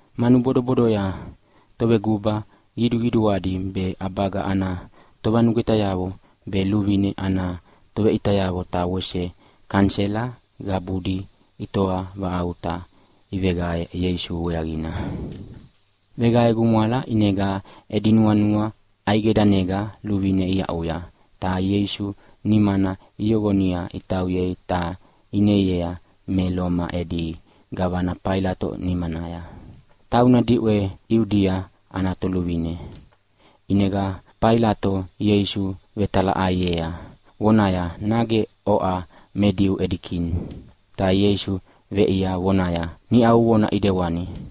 Manu bodobodoya toveguba qiduqiduadi be ʼabaga ana tovanugwetayavo be luvine ana toveʼitayavo ta wese kanisela qabudi itoa vaʼauta iveveqae Ieisu weaqina. Veqae gumwala, ʼinega edi nuanua ʼaideganega luvine iaʼuya ta Ieisu nimana iyoqonia itauyei ta ineiea me Loma edi gavana Failato nimanaya, tauna diʼwe Iudia ana toluvine. ʼInega Failato Ieisu vetalaʼaiea vonaya, “Nage oʼa me Diu edi Kini?” Ta Ieisu veʼiea vonaya, “Niʼa uvona ʼidewana.”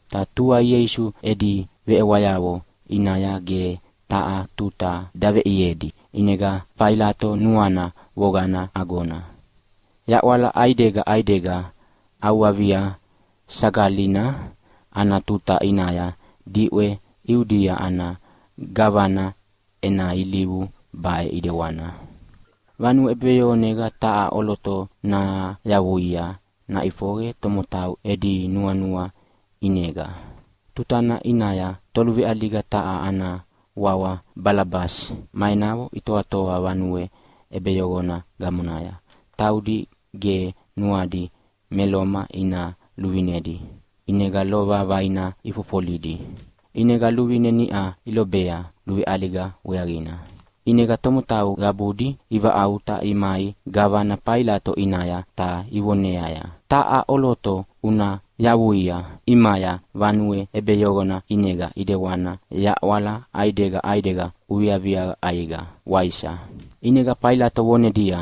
Ta tua Ieisu edi veʼewayavo ʼinaya ge taha tuta daveʼiedi, ʼinega Failato nuana voqana agona. Yaʼwala ʼaidega ʼaidega ʼAuvivia Sagalina ana tuta ʼinaya diʼwe Iudia ana gavana ena ilivu baʼe ʼidewana. Vanue ʼebeyoqonega taha ʼoloto nayavuia naʼifoqe tomotau edi nuanua ʼinega. Tutana ʼinaya toluveʼaliga taha ana wawa Balabasi ma enavo itoatoa vanue ʼebeyoqona gamonaya. Taudi ge nuadi me Loma ina luvinedi, ʼinega lova vaina ifofolidi. ʼInega luvine niʼa ilobea luveʼaliga weaqina. ʼInega tomotau qabudi ivaʼauta imai gavana Failato ʼinaya ta ivoneaya, “Taha ʼoloto una yavuia ʼimaya vanue ʼebeyoqona ʼinega ʼidewana yaʼwala ʼaidega ʼaidega uviaviaqa ʼaiqa, waisa?” ʼInega Failato vonedia,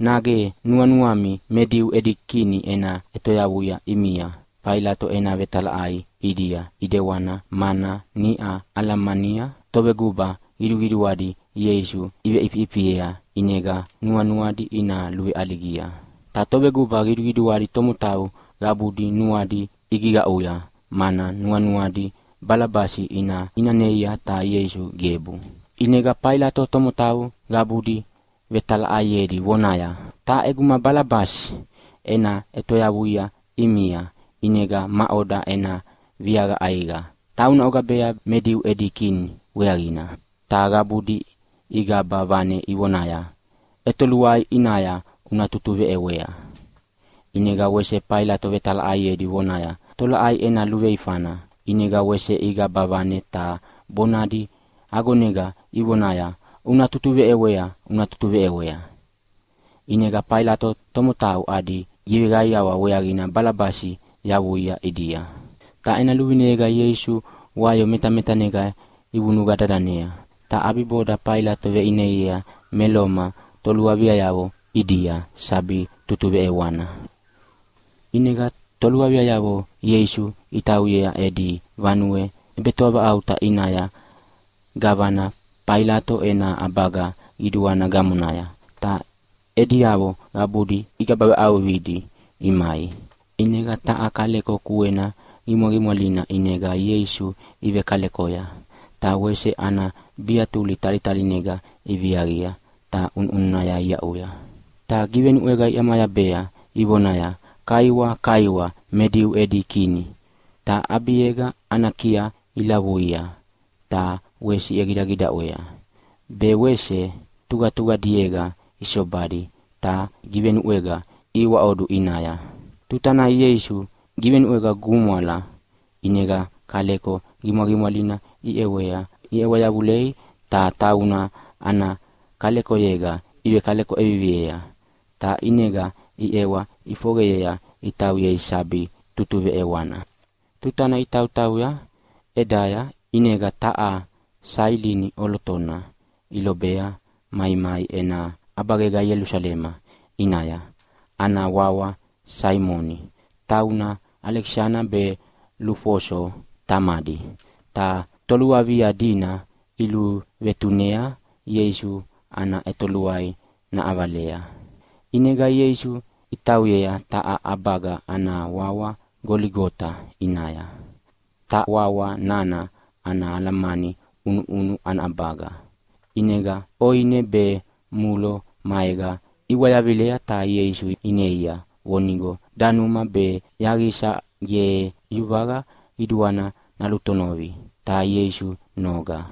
“Nage nuanuami me Diu edi Kini ena ʼetoyavuia ʼimia?” Failato ena vetalaʼai ʼidia ʼidewana mana niʼa alamania toveguba qiduqiduadi Ieisu iveʼifiʼifiea ʼinega nuanuadi ina luveʼaligia. Ta toveguba qiduqiduadi tomotau qabudi nuadi igiqaʼuya, mana nuanuadi Balabasi ina ʼinanea, ta Ieisu gebu. ʼInega Failato tomotau qabudi vetalaʼaiedi vonaya, “Ta ʼeguma Balabasi ena ʼetoyavuia ʼimia, ʼinega maʼoda ena viaqa ʼaiqa tauna ogabea me Diu edi Kini weaqina?” Ta qabudi igaba vane ivonaya, “ʼEtoluai ʼinaya una tutuveʼewea!” ʼInega wese Failato vetalaʼaiedi vonaya, “Tolaʼai ena luveifana?” ʼInega wese igaba vane ta bonadi agonega ivonaya, “Una tutuveʼewea, una tutuveʼewea!” ʼInega Failato tomotau adi giveqaiawa weaqina Balabasi yavuia ʼidia. Ta ena luvineyega Ieisu wayo metametanega ivunuqa dadanea, ta ʼabiboda Failato veʼineiea me Loma toluaviayavo ʼidia sabi tutuveʼewana. ʼInega toluaviayavo Ieisu itauyea edi vanue ʼebetoavaʼauta ʼinaya gavana Failato ena ʼabaga qiduana gamonaya, ta ediavo qabudi igaba vaʼauqidi imai. ʼInega taha kaleko kuena qimwaqimwalina ʼinega Ieisu ivekalekoya, ta wese ana biatuli talitaliega iviaqia ta ʼunuʼununaya iaʼuya. Ta givenuʼwega iʼamayabea ivonaya, “Kaiwa, kaiwa me Diu edi Kini!” Ta ʼabiega ana kiaya ilavulavua ta wese iʼegidagidaʼwea. Be wese tuqatuqadiega isobadi ta givenuʼwega ihiwaʼodu ʼinaya. Tuta nana Ieisu igivenuʼwea gumwala, ʼinega kaleko qimwaqimwalina iʼewa yavulei ta tauna ana kalekoyega ivekaleko ʼeviviea. Ta ʼinega iʼewa ʼifoqeyea itauyea sabi tutuveʼewana. Tutana itautauya ʼedaya ʼinega taha Sailini ʼolotona ilobea maimai ena ʼabagega Ielusalema ʼinaya. Ana wawa Saimoni, tauna Alekisana be Lufoso tamadi. Ta toluavia dina iluvetunea Ieisu ana ʼetoluai naʼavalea. ʼInega Ieisu itauyea taha ʼabaga ana wawa Goligota ʼinaya, ta wawa nana ana alamani “ʼUnuʼunu ana ʼabaga”. ʼInega ʼoine be mulo maega iwayavilea ta Ieisu ineia vonigo danuma be yaqisa ge yuvaqa qiduana nalutonovi, ta Ieisu noga.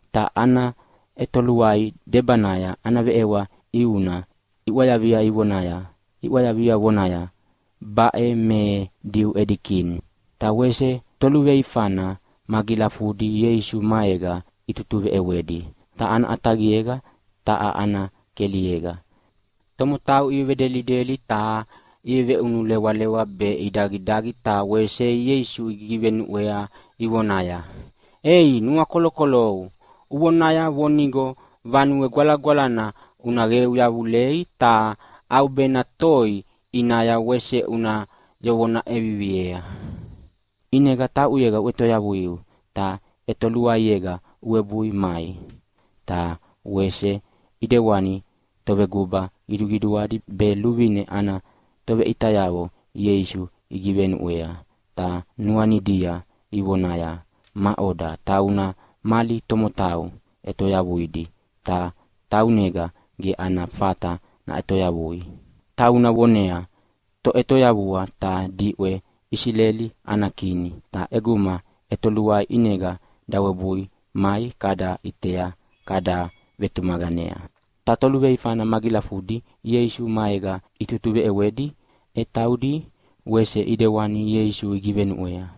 Ta ana ʼetoluai debanaya ana veʼewa ʼiuna iʼwayavia vonaya, “Baʼe me Diu edi Kini.” Ta wese toluveifana magilafudi Ieisu maega itutuveʼewedi taha ana ʼataqiega, ta taha ana keliega. Tomotau ivevedelideli ta iveveʼunulewalewa be idagidagi ta wese Ieisu igigivenuʼwea ivonaya, “Ei nuakolokolou! Uvonaya vonigo Vanue Gwalagwalana una qeu yavulei ta ʼaubena toi ʼinaya wese una yoqona ʼeviviea. ʼInega tauʼuyega uʼetoyavuiu ta ʼetoluaiega uwebui mai!” Ta wese ʼidewani toveguba qiduqiduadi be luvine ana toveʼitayavo Ieisu igivenuʼwea ta nuanidia ivonaya, “Maʼoda tauna mali tomotau ʼetoyavuidi ta taunega ge ana fata naʼetoyavui. Tauna vonea Toʼetoyavua ta diʼwe Isileli ana Kini, ta ʼeguma ʼetoluai ʼinega dawebui mai kada ʼitea kada vetumaqanea.” Ta toluveifana magilafudina Ieisu maega itutuveʼewedi e taudi wese ʼidewana Ieisu igivenuʼwea.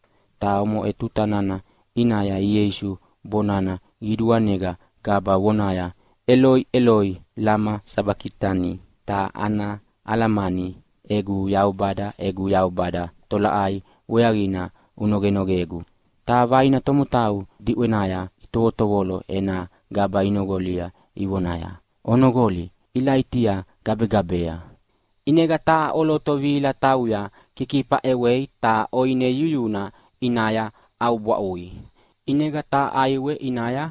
Ta omoʼe tuta nana ʼinaya Ieisu bonana qiduanega gaba vonaya, “Eloi, Eloi, lama sabakitani?”, ta ana alamani, “Egu Yaubada, egu Yaubada, tolaʼai weaqina unogenogegu?” Ta vaina tomotau diʼwenaya itovotovolo ena gaba inoqolia ivonaya, “Onoqoli, Ilaitia gabegabea!” ʼInega taha ʼoloto vihila tauya kikifa ʼewei ta ʼoine yuyuna ʼinaya ʼaubwaʼui ʼinega taha ʼaiwe ʼinaya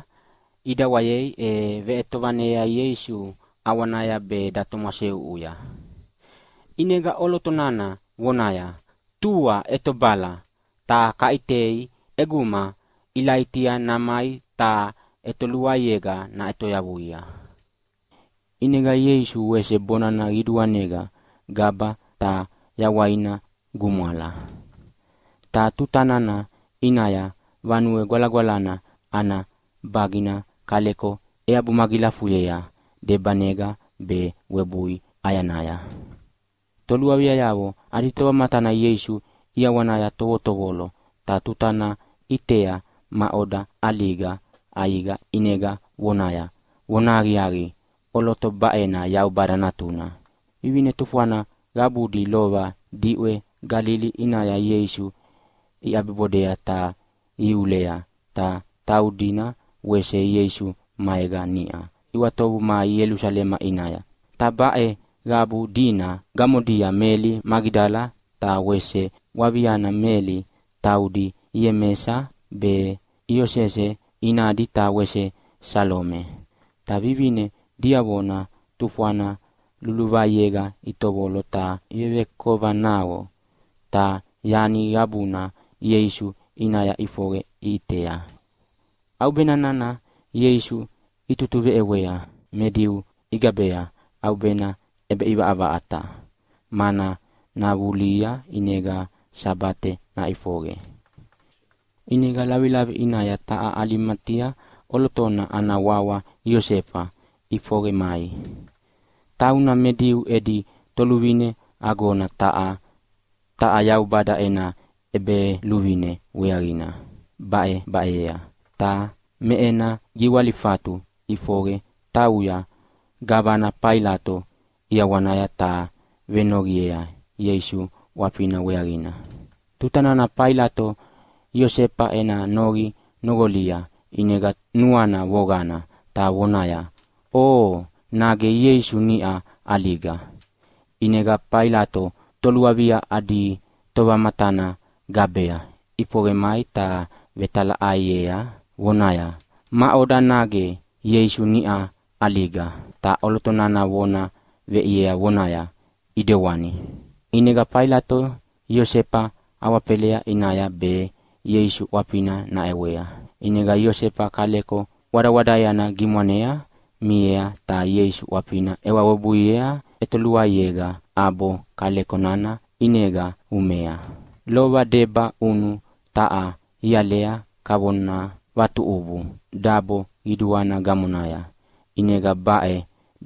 ʼidawayei e veʼetovaneyea Ieisu ʼawanaya be datomwaseʼuʼuya. ʼInega ʼoloto nana vonaya, “Tua ʼetobala, ta kaʼitei ʼeguma Ilaitia namai ta ʼetoluaiega naʼetoyavuia.” ʼInega Ieisu wese bonana qiduanega gaba ta yawaina gumwala. Ta tuta nana ʼinaya Vanue Gwalagwalana ana bagina kaleko eabu magilafuyea debanega be webui ʼayanaya. Toluaviayavo adi tovamatana Ieisu ʼiawanaya tovotovolo, ta tuta nana ʼitea maʼoda ʼaliga ʼaiqa ʼinega vonaya, “Vonahaqiaqi, ʼoloto baʼena Yaubada Natuna.” Vivine tufwana qabudi lova diʼwe Galili ʼinaya Ieisu iʼabibodea ta ihiulea, ta taudina wese Ieisu maega niʼa iʼwatovu mai Ielusalema ʼinaya. Ta baʼe qabu dina gamodia Meli Magidala ta wese waviana Meli, taudi Iemesa be Iosese inadi ta wese Salome. Ta vivine diavona tufwana luluvaiega itovolo ta ivevekova naqo, ta yani qabuna Ieisu ʼinaya ʼifoqe iʼitea. ʼAubena nana Ieisu itutuveʼewea me Diu igabea ʼaubena ʼebeʼivaʼavaʼata, mana navulihia ʼinega Sabate naʼifoqe. ʼInega lavilavi ʼinaya taha Alimatia ʼolotona ana wawa Iosefa ʼifoqe mai. Tauna me Diu edi toluvine agona taha, ta Yaubada ena ʼEbeluvine weaqina baʼebaʼeyea. Ta me ena giwalifatu ʼifoqe tauya gavana Failato ʼiawanaya ta venoqiea Ieisu ʼwafina weaqina. Tuta nana Failato Iosefa ena noqi noqolia ʼinega nuana voqana, ta vonaya, “Oo, nage Ieisu niʼa ʼaliga?” ʼInega Failato toluavia adi tovamatana gabea ʼifoqe mai ta vetalaʼaiea vonaya, “Maʼoda, nage Ieisu niʼa ʼaliga?” Ta ʼoloto nana vona veʼiea vonaya, “ʼEdewani”. ʼInega Failato Iosefa awafela ʼinaya be Ieisu ʼwafina naʼewea. ʼInega Iosefa kaleko wadawadaeana gimwanea miea, ta Ieisu ʼwafina ʼewa webuiea ʼetoluaiega ʼabo kaleko nana ʼinega umea. Lova debaʼunu taha ialea kavona vatuʼubu dabo qiduana gamonaya, ʼinega baʼe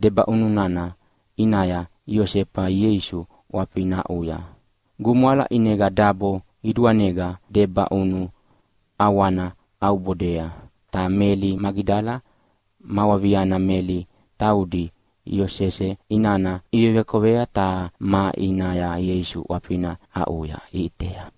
debaʼunu nana ʼinaya Iosefa Ieisu ʼwafina aʼuya. Gumwala, ʼinega dabo qiduanega debaʼunu ʼawana ʼaubodea. Ta Meli Magidala ma waviana Meli taudi Iosese inana ivevekova, ta maʼinaya Ieisu ʼwafina aʼuya iʼitea.